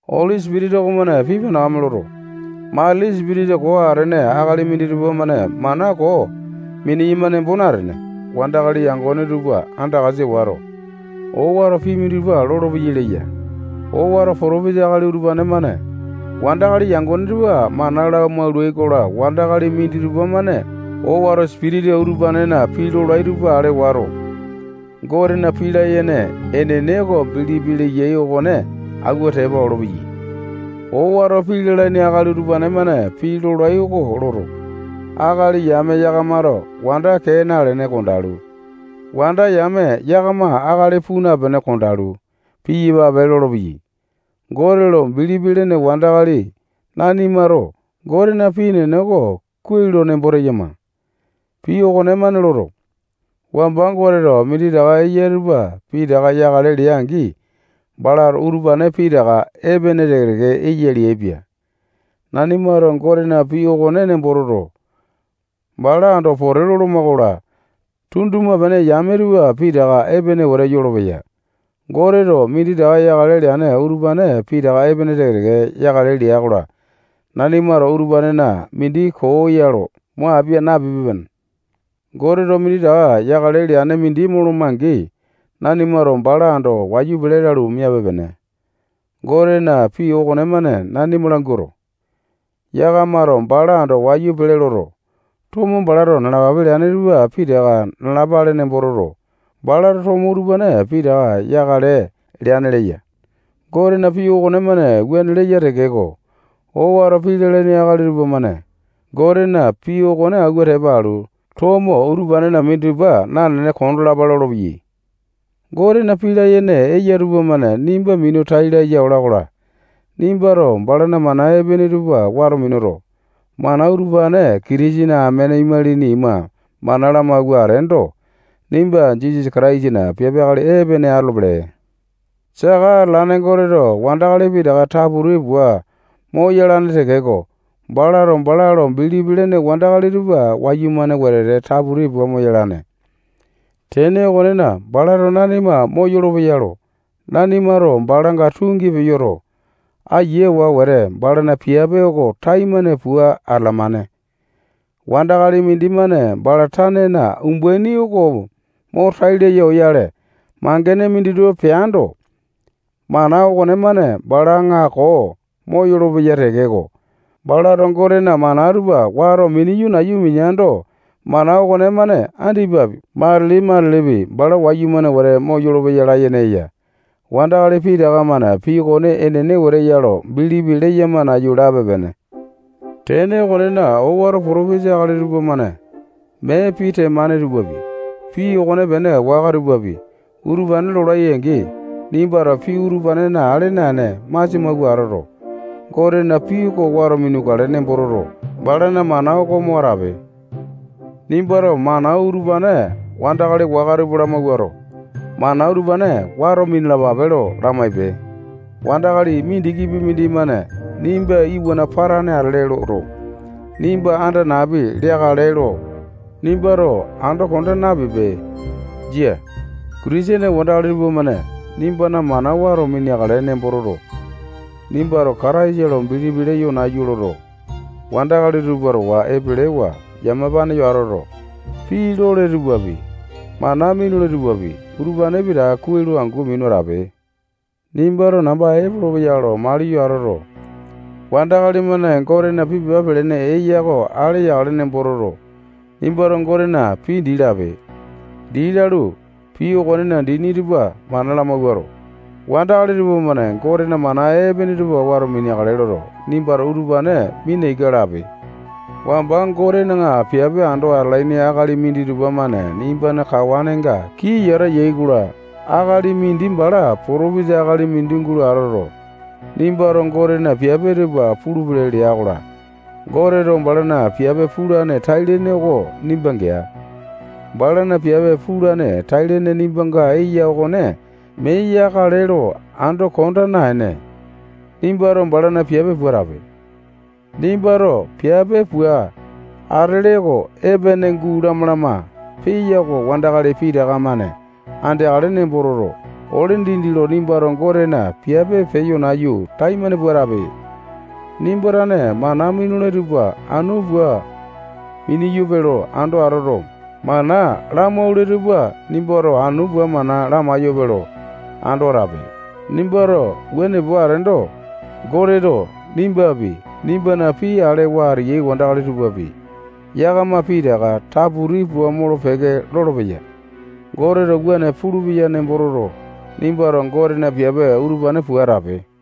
Oli Sipitisa okomane pii panakame loto, matili sipitisa koo atene akali minditupa-mane mana koo miniyama nembo natene, wandakali yangone tupa andakasa wato, owato pii minditupa lolopeyai leya. Owato potopesa akali utupane-mane wandakali yangone tupa mana lamaulai-kola, wandakali minditupa-mane owato sipitisa utupanena pii lolai tupa ale wato, Gotena pii layene enene oko bilipi leyai okone awua tepa olopeyai. Owato pii lalaini akali utupane-mane pii lolai oko loto, akali yame yakamato wanda kee nalene kondalu, wanda yame yakama akali puu napene kondalu, piyapape lolopeyai. Gote lo bilipi lene wandakali nanimato Gotena pii enene oko kuai lo nembo teyama. Pii okonemane loto, wamba Goteto minditaka eya tupa pitaka yakale lea-angi, balato utupane pitaka epene teke-teke eya leaipia. Nanimato Gotena pii okone nembo toto, bala ando pote loloma-kola, tunduma-pene yame tupa pitaka epene wete yolopeya. Goteto minditaka yakale leane utupane pitaka epene teke-teke yakale lea-kola, nanimato utupanena mindi koo ya loto, mo apia napipe-pene. Goteto minditaka yakale leane mindi moloma-angi, nanimato bala ando wayu pele lalu, miape-pene. Gotena pii okonemane nanima languato, yakamato bala ando wayu pele loto, tomo balato yakale leane tupa pitaka nalapale nembo toto, balato tomo utupane pitaka yakale leane leya. Gotena pii okonemane wuane leya tekeko, owato pii lalaini akali tupamane Gotena pii okone awua tepa alu, tomo utupanena minditupa nanene kondalapa lolopeyai. Gotena pii layene eya tupamane nimba minu tai laya ola-kola, nimbato balana mana epene tupa wato minuto, mana utupane Kitisene amene imalini ima mana lamawua ateendo, nimba Jisasa Kataisana piape akali epene atolopele. Saka atalane Goteto wandakali pitaka taputi pua moyalane tekeko, balato bala lo bilipi lene wandakali tupa wayumane wetete taputi pua moyalane. Tene okonena, balato nanima moyolo-peya lo nanimato balanga tungi peyoto, ayiawa wete balana piape oko taimane pua atalamane. Wandakali mindimane bala tanena umbaini oko mo tai laya oyale, mangene minditupa peando, mana okonemane bala aŋako moyolo-peya tekeko, balato Gotena mana tupa wato mineyo nayu mineando, mana okonemane andipapi, matili matilipi, bala wayumane wete moyolo-peya layene eya. Wandakali pitaka-mane pii okone enene wete eya lo bilipi leyama nayu lape-pene. Tene okonena, owato potopisa akali tupamane mee pii temane tupapi, pii okonepene waka tupapi, utupane lolai-angi, nimbato pii utupane ale naene masia mawua atoto, Gotena pii oko wato minukale nembo toto, balana mana oko mo atape. Nimbato mana utupane wandakali waka tupa lamawuato, mana utupane wato minalapape lo lamaipe. Wandakali mindikipi mindimane nimba iwana patane atele loto, nimba anda napi leakale lo nimbato ando konda napipe. Jia. Kitisene wandakali tupamane nimbana mana wato mineakale nembo toto, nimbato Kataisa lo bilipi leyo nayu loto, wandakali tupa towa epelewa yamapane yo atoto, pii lole tupapi, mana minule tupapi, utupane pitaka kuai lo angu minu atape. Nimbato namba epolopeya lo maliyo atoto, wandakali-mane Gotena pii pepa pelene eya oko ale yakale nembo toto, nimbato Gotena pii dii lape. Dii lalu, pii okonena dini tupa mana lamawuato, wandakali tupamane Gotena mana epene tupa wato mineakale loto, nimbato utupane mina ika lape. Wamba Gotena piape ando atalaini akali minditupa-mane nimbana kawanenga kii yata yai-kola, akali mindi bala potopesa akali mindi gulo atoto, nimbato Gotena piape tupa pulupele lea-kola, Goteto balana piape pulane tai-lene oko nimba gea. Balana piape pulane tai-lene nimbanga eya okone mee yakale lo ando konda naene, nimbato balana piape pua atape. Nimbato piape pua atele oko epene guu lama-lama peya oko wandakali pitaka-mane andeakale nembo toto, ole dindi lo nimbato Gotena piape peyo nayu, taimane pua atape. Nimba tane mana minule tupa anu pua miniyope lo ando atoto, mana lamaule tupa nimbato anu pua mana lamaiyope lo ando atape. Nimbato wuane pua ateendo, Goteto nimbapi, nimbana pii alewa ateyai wandakali tupapi, yakama pitaka taputi pua molo-peke lolopeya. Goteto wuane pulupeya nembo toto, nimbato Gotena piape utupane pua atape.